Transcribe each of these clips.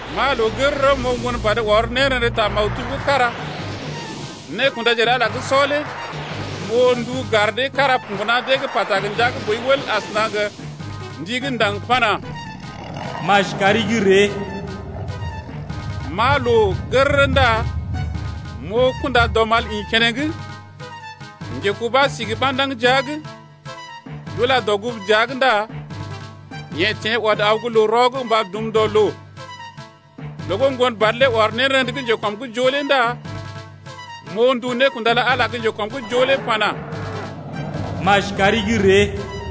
M’aa loo gərərə m’oo Ŋgonbad ɔr nérḛdə ta maktub gə́ kára, nékundaje lə Ala gə́ sɔ lé m’oo ndu gar dee gə́ kára mbuna dee’g pata gə ndia gə́ boi wəl asəna gə ndi gə́ ndaŋg pana: Maji kari gə́ ree! M’aa loo gərərə ndá m’oo kunda-dɔmal ḭ keneŋ. Njekubá si gə ɓandaŋg jia’g. D’ula dɔgugu dəa’g ndá yeḛ teḛ ɔd aw gə́ loo-rɔ’g mba dum dɔ loo. Loo gə́ Ŋgonbad lé ɔr nérḛdə gə́ njekɔm’g joo lé ndá m’oo ndu nékunda lə Ala gə́ njekɔm’g joo lé pana: Maji kari gə́ ree.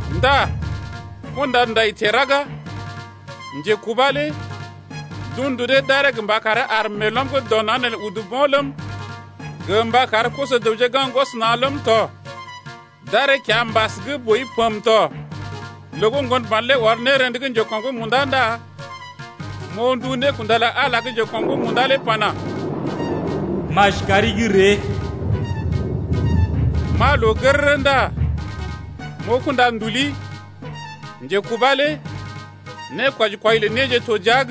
Ndá kunda-ndai teḛ raga. Njekubá lé d’un ndu dee d’aree gə mba karee ar meelɔm gə́ dɔ naŋg neelé udu bo̰ ləm, gə mba kar koso-dəwje gaŋg gwɔs na̰ ləm tɔ. D’aree kiambas gə́ boi pəmə tɔ. Loo gə́ Ŋgonbad lé ɔr nérḛdə gə́ njekɔm’g munda ndá m’oo ndu nékunda lə Ala gə́ njekɔm’g munda lé pana: Maji kari gə́ ree. M’aa loo gərərə ndá m’oo kunda-nduli. Njekubá lé nékwɔji kwɔi lə néje to jia’g.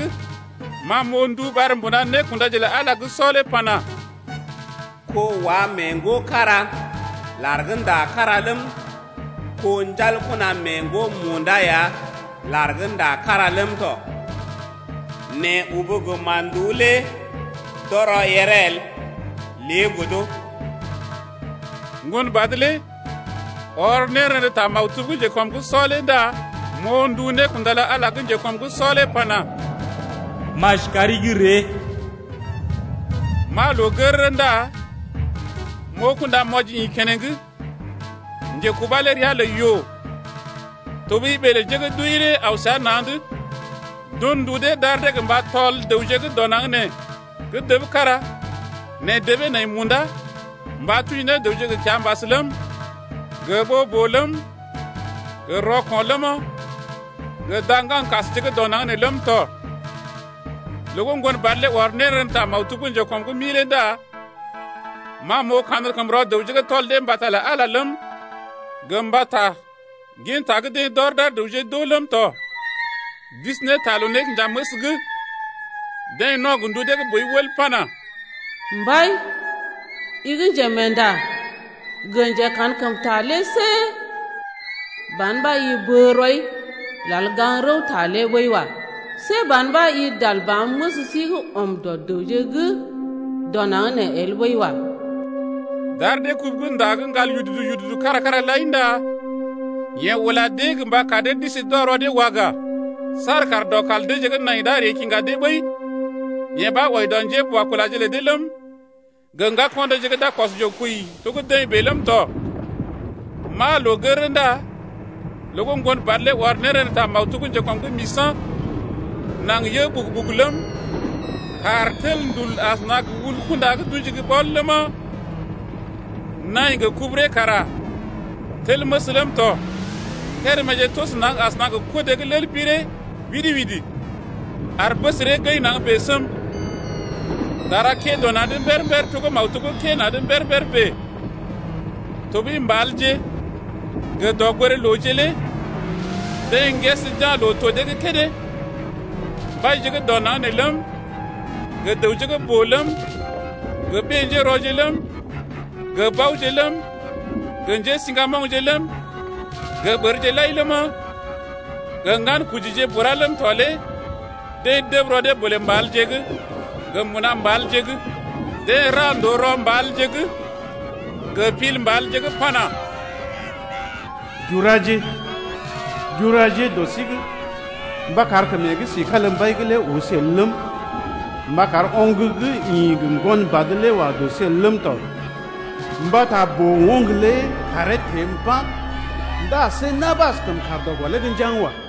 Ma m’oo ndu ɓar mbuna nékundaje lə Ala gə́ sɔ lé pana: Ko-wa mee ŋgo kára, lar gə́ nda kára ləm, kó-ɔrj mee ŋgo munda ya lar gə́ nda kára ləm tɔ, nɛ ubu gə mán-nduú lé d’ɔrɔ yèree el lé godo. Ŋgonbad lé ɔr nérḛdə ta maktub gə́ njekɔm’g sɔ lé ndá m’oo ndu nékunda lə Ala gə́ njekɔm’g sɔ lé pana: Maji kari gə́ ree. M’aa loo gərərə ndá m’oo kunda-mwɔji ḭ keneŋ. Njekubá lé ria lə yoo tɔɓəi ɓee lə njé gə́ d’wəi lé aw səa na̰’d. D’un ndu dee d’ar dee gə mba tɔl dəwje gə́ dɔ naŋg nee gə́ dəb kára nɛ debee nai munda, mba tuji ne dəwje gə kiambas ləm, gə ɓoo-boo ləm, gə rɔko̰ ləma, gə da-ŋgaŋkasje gə́ dɔ naŋg nee ləm tɔ. Loo gə́ Ŋgonbad lé ɔr nérḛdə ta maktub gə́ njekɔm’g mi lé ndá ma m’oo kankəmrɔ dəwje gə́ tɔl dee mbata lə Ala ləm, gə mbata ginta gə́ deḛ d’ɔr d’ar dəwje d’oo ləm tɔ d’isi ne ta loo-nékinjaməs’g. Deḛ no̰ gə ndu dee gə́ boi wəl pana: Mbai, i gə́ njemeenda gə njekankəmta lé see ban ɓa i bə rɔi lal gaŋg rəwta lé ɓəi wa. See ban ɓa i dal ba̰ məs sí gə́ ɔm dɔ dəwje gə́ dɔ naŋg nee el ɓəi wa. D’ar dee kubu gə́ nda gə́ ŋgal yududu-yududu kára-kára lai ndá yeḛ ula dee mba kar dee d’isi d’wa rɔ dee waga saar kar dɔkal deeje gə́ nai d’a ree kiŋga dee ɓəi, yee ɓa wɔji dɔ njéboakulaje lə dee ləm, gə ŋgako̰ deeje gə́ d’a kɔs yoo kwəi to gə́ deḛ bèe ləm tɔ. M’aa loo gərərə ndá loo gə́ Ŋgonbad lé ɔr nérḛdə ta maktub gə́ njekɔm’g misa̰. Naŋg yə ɓugu-ɓugu ləm, kàr tel ndul asəna gə wul-kunda gə́ d’ṵji gə́ ɓɔl ləma, naḭ gə kuburee kara tel məs ləm tɔ. Kéréméje toso naŋg asəna gə kodé gə́ lel-boo ɓiree widi-widi ar bəsəree gəḭ naŋg bèe səm. Dara kə́ dɔ na̰’d mber-mber to gə́ maktub gə́ kə́ na̰’d mber-mber bèe tɔɓəi mbalje gə dɔgoré-looje lé dee ŋgəs d’ya̰ loo-to dee gə́ kédé. Mbaije gə́ dɔ naŋg nee ləm, gə dəwje gə́ boo ləm, gə ɓé-njérɔje ləm, gə baoje ləm, gə njésiŋgamoŋje ləm, gə ɓərje lai ləma, gə ŋgankojije bura ləm tɔ lé deḛ dəb rɔ dee bolè mbalje’g gə mbuna mbalje’g. Deḛ ra ndòo rɔ mbalje’g gə pil mbalje’g pana: Juraje, juraje dɔ sí’g, mba kar kəm yeḛ gə́ si kalimbai’g lé oo sí el ləm, mba kar oŋg gə́ ḭ gə Ŋgonbad lé wa dɔ sí el ləm tɔ. Mbata boo-oŋg lé kàree teḛ mba̰ ndá see na̰ ɓa askəm kaar dɔ gɔlee’g njaŋg wa.